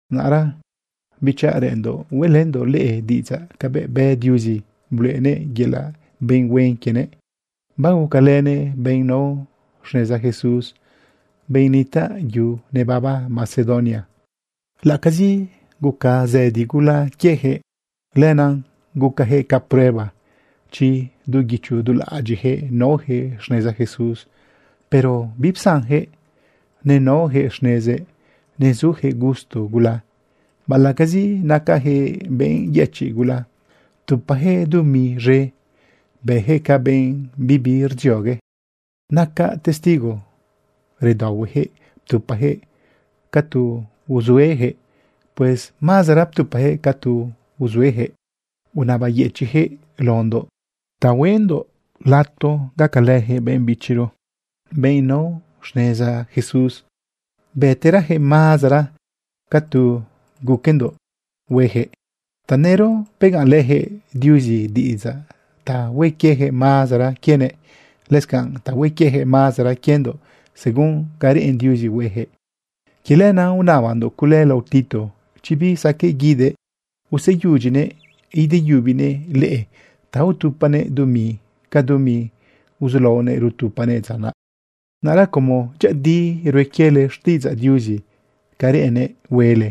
Naꞌra bichaꞌ, reꞌenndoꞌ hueꞌlëndoꞌ leꞌe diꞌidzaꞌ cabëꞌ bë Diuzi bluꞌenëꞌ yelaꞌ benꞌ huen quienëꞌ, bagucalënëꞌ benꞌ nao xneza Jesús, benꞌ nitaꞌ yu nebaba Macedonia. Laꞌacazi guca zëdi gula quiejëꞌ, lenaꞌ gucajëꞌ ca prueba chi du guicho du laꞌadyiꞌjëꞌ naojëꞌ xneza Jesús, pero bipsanjëꞌ, nenaojëꞌ xnezëꞌ nezujëꞌ gusto gula. Baꞌalaꞌcazi nacajëꞌ benꞌ yëchiꞌ gula, ptupajëꞌ dumi z̃e. Bëjëꞌ ca benꞌ bibi rdziogue. Nacaꞌ testigo redaohuejëꞌ ptupajëꞌ ca tu uzuejëꞌ. Pues mazara ptupajëꞌ ca tu uzuejëꞌ. Unabayëchiꞌjëꞌ laondoꞌ ta hueꞌndoꞌ lato gacalëjëꞌ benꞌ bichiro, benꞌ nao xneza Jesús. Bëterajëꞌ mazara ca tu guquendoꞌ huejëꞌ. Tanëro begaꞌnlëjëꞌ Diuzi diꞌidzaꞌ ta hue quieyaquëꞌ mazara quienëꞌ, lëscanꞌ ta hue quieyaquëꞌ mazara quiendoꞌ según ca reꞌen Diuzi huejëꞌ. Quie lenaꞌ unabandoꞌ cule lao Tito chi bisaqueꞌ guidëꞌ useyudyinëꞌ ideyubinëꞌ leꞌe ta utupanëꞌ dumi ca dumi uzulaonëꞌ rutupanëꞌ dza naꞌ. Naꞌra como dyëꞌëdi rue quiele xtiꞌidzaꞌ Diuzi ca reꞌennëꞌ huele,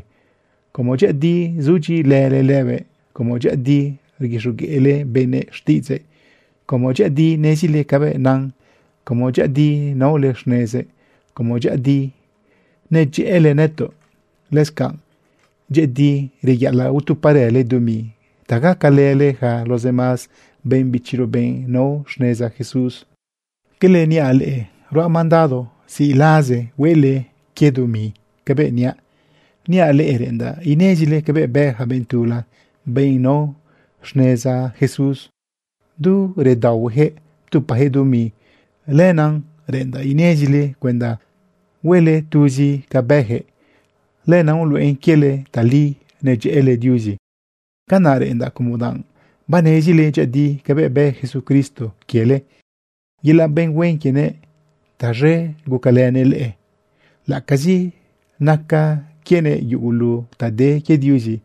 como dyëꞌëdi zudyiꞌilële lëbëꞌ, como dyëꞌëdi rguixogueꞌle benëꞌ xtiꞌidzëꞌ, como dyëꞌëdi nezile cabëꞌ nan, como dyëꞌëdi naole xnezëꞌ, como dyëꞌëdi nedyëꞌële nëtoꞌ, lëscanꞌ dyëꞌëdi reyaꞌalaꞌ utuparële dumi ta gacalële yaca los demás benꞌ bichiro, benꞌ nao xneza Jesús. Quele niaꞌ leꞌe ruaꞌ mandado ziꞌlaza huele quie dumi cabëꞌ niaꞌ. Niaꞌ leꞌe reꞌendaꞌ inezile cabëꞌ bë ja benꞌ tula, benꞌ nao xneza Jesús. Du redaohuejëꞌ ptupajëꞌ dumi. Lenaꞌ reꞌendaꞌ inezile cuenda huele tuzi ca bëjëꞌ. Lenaꞌ uluꞌen quiele tali nedyëꞌële Diuzi. Canaꞌ reꞌendaꞌ como danꞌ banezile dyëꞌëdi cabëꞌ bë Jesucristo quiele. Yelaꞌ benꞌ huen quienëꞌ taz̃e gucalënëꞌ leꞌe. Laꞌacazi naca quienëꞌ yugulu ta de quie Diuzi,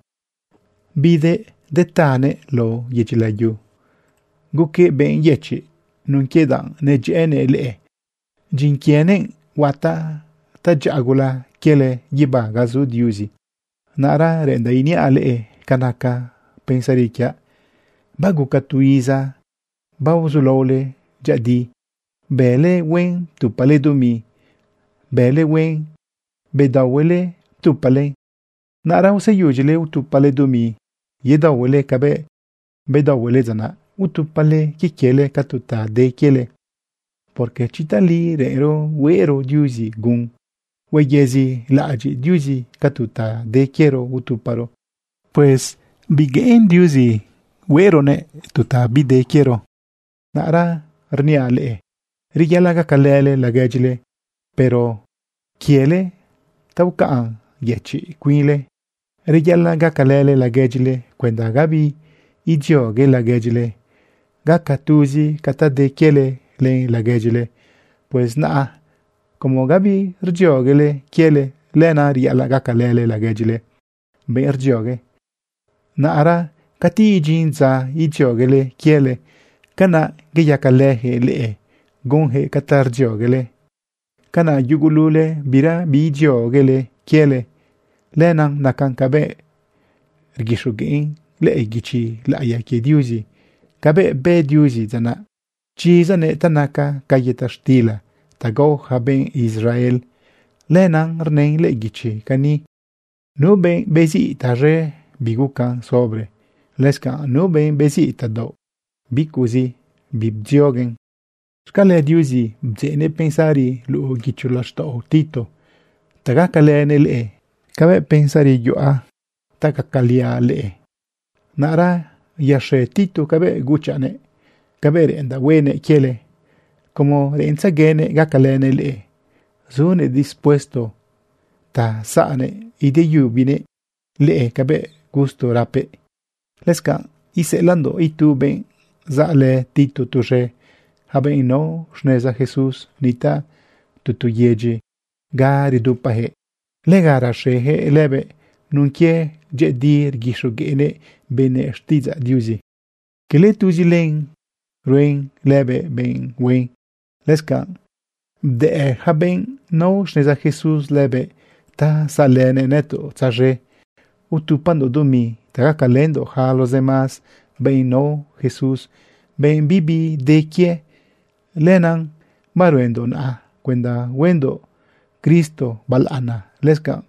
bidëꞌ detëꞌë lao yedyi layu, guquëꞌ benꞌ yëchiꞌ nun quie danꞌ nedyëꞌënëꞌ leꞌe. Dyin quienëꞌ huataꞌ tadyaꞌa gula quiele guibá ga zu Diuzi. Naꞌra reꞌendaꞌ iniaꞌ leꞌe ca naca pensari quiaꞌ. Baguca tu iza baozulaole dyëꞌëdi. Bële huen ptupale dumi. Bële huen bedaohuele ptupalen. Naꞌra useyudyile utupale dumi yedaohuele cabëꞌ bedaohuele dza naꞌ. Utupale quie quiele ca tu ta de quiele. Porque chi tali reꞌenro hueꞌro Diuzi gun, huayezilaꞌadyiꞌ Diuzi ca tu ta de quiero utuparo. Pues bigueꞌen Diuzi hueꞌronëꞌ tu ta bide quiero. Naꞌra niaꞌ leꞌe reyaꞌalaꞌ gacalële laguedyile, pero quiele ta ucaꞌn yëchiꞌle cuinle. Reyaꞌalaꞌ gacalële laguedyile cuenda gabi idziogue laguedyile, gaca tuzi ca ta de quiele len laguedyile. Pues naꞌa como gabi rdzioguele quiele, lenaꞌ reyaꞌalaꞌ gacalële laguedyile benꞌ rdziogue. Naꞌra cati idyin dza idzioguele quiele, canaꞌ iyacalëjëꞌ leꞌe gunjëꞌ ca ta rdzioguele. Canaꞌ yugulule birabi idzioguele quiele. Lenaꞌ nacan cabëꞌ rguixogueꞌn lëꞌë guichi laꞌiya quie Diuzi cabëꞌ bë Diuzi dza naꞌ, pchizanëꞌ ta naca ca yëta xtila ta gao ja benꞌ Israel. Lenaꞌ rnën lëꞌë guichi cani: “Nu benꞌ beziꞌ tazë, bigucan sobre. Lëscanꞌ nu benꞌ beziꞌ tadaoꞌ bicuꞌzi, bibdzioguen.” Xcale Diuzi bdzeꞌnëꞌ pensari luꞌu guicho laxtaꞌo Tito ta gacalënëꞌ leꞌe cabëꞌ pensari yuꞌa ta gacaliaꞌ leꞌe. Naꞌra yaxe Tito cabëꞌ guchaꞌnëꞌ cabëꞌ reꞌendaꞌ huenëꞌ quiele. Como reꞌentzeguenëꞌ gacalënëꞌ leꞌe, zunëꞌ dispuesto ta saꞌnëꞌ ideyubanëꞌ leꞌe cabëꞌ gusto rapëꞌ. Lëscanꞌ iseꞌelaꞌndoꞌ itu benꞌ saꞌlë Tito tuz̃e. Ja benꞌ nao xneza Jesús nitaꞌ tu tu yedyi ga redupajëꞌ, lega raxejëꞌ lëbëꞌ nun quie dyëꞌëdi rguixogueꞌnëꞌ benëꞌ xtiꞌidzaꞌ Diuzi. Cala tuzi len ruen lëbëꞌ benꞌ huen, lëscanꞌ bdëꞌ ja benꞌ nao xneza Jesús lëbëꞌ ta saꞌlënëꞌ nëtoꞌ tzaz̃e utupandoꞌ dumi ta gacalëndoꞌ yaca los demás benꞌ nao Jesús, benꞌ bibi de quie. Lenaꞌ baruendoꞌ naꞌa cuenda huendoꞌ Cristo balaꞌana, lëscanꞌ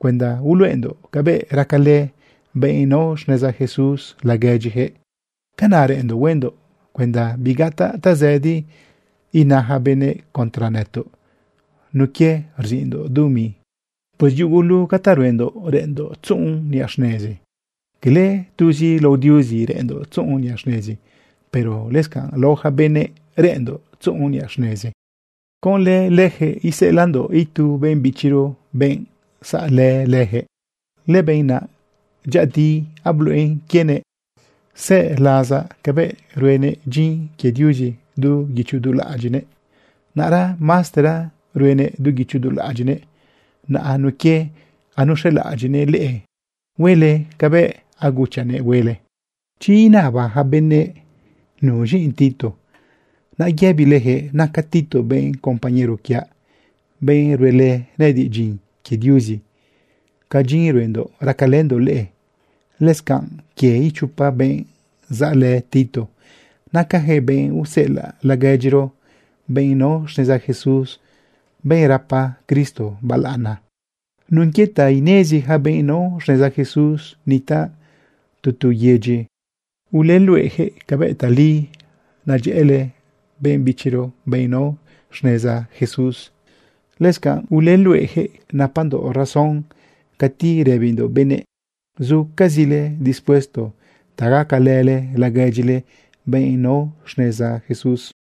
cuenda uluꞌendoꞌ cabëꞌ racalë benꞌ nao xneza Jesús laguedyijëꞌ. Canaꞌ reꞌenndoꞌ huendoꞌ cuenda bigataꞌ tazëdi ina ja benëꞌ contra nëtoꞌ nun quie rziꞌndoꞌ dumi. Pues yugulu ca ta ruendoꞌ reꞌenndoꞌ tzuꞌun niꞌa xnezi. Cala tuzi lao Diuzi reꞌenndoꞌ tzuꞌun niꞌa xnezi, pero lëscanꞌ lao ja benëꞌ reꞌenndoꞌ tzuꞌun niꞌa xnezi. Conlë lëjëꞌ iseꞌelaꞌndoꞌ itu benꞌ bichiro, benꞌ saꞌlë lëjëꞌ. Lëbenꞌ naꞌ dyëꞌëdi abluꞌen quienëꞌ zë lasa cabëꞌ ruenëꞌ dyin quie Diuzi du guicho du laꞌadyiꞌnëꞌ. Naꞌra maztera ruenëꞌ du guicho du laꞌadyiꞌnëꞌ naꞌa nun quie anuxelaꞌadyiꞌnëꞌ leꞌe huele cabëꞌ aguchaꞌnëꞌ huele. Chi inaba yaca benëꞌ nuz̃i Tito, naꞌ yëbilejëꞌ naca Tito benꞌ compañero quiaꞌ, benꞌ ruelë nëꞌëdiꞌ dyin quie Diuzi ca dyin ruendoꞌ racalëndoꞌ leꞌe. Lëscanꞌ quie ichopa benꞌ saꞌlë Tito, nacajëꞌ benꞌ useꞌelaꞌ laguedyiro benꞌ nao xneza Jesús, benꞌ rapa Cristo balaꞌana. Nun quie ta inezi ja benꞌ nao xneza Jesús nitaꞌ tu tu yedyi, uleluꞌejëꞌ cabëꞌ tali nedyëꞌële benꞌ bichiro benꞌ nao xneza Jesús. Lëscanꞌ uleluꞌejëꞌ napandoꞌ razón cati rëbindoꞌ benëꞌ zucazile dispuesto ta gacalële laguedyile, benꞌ nao xneza Jesús.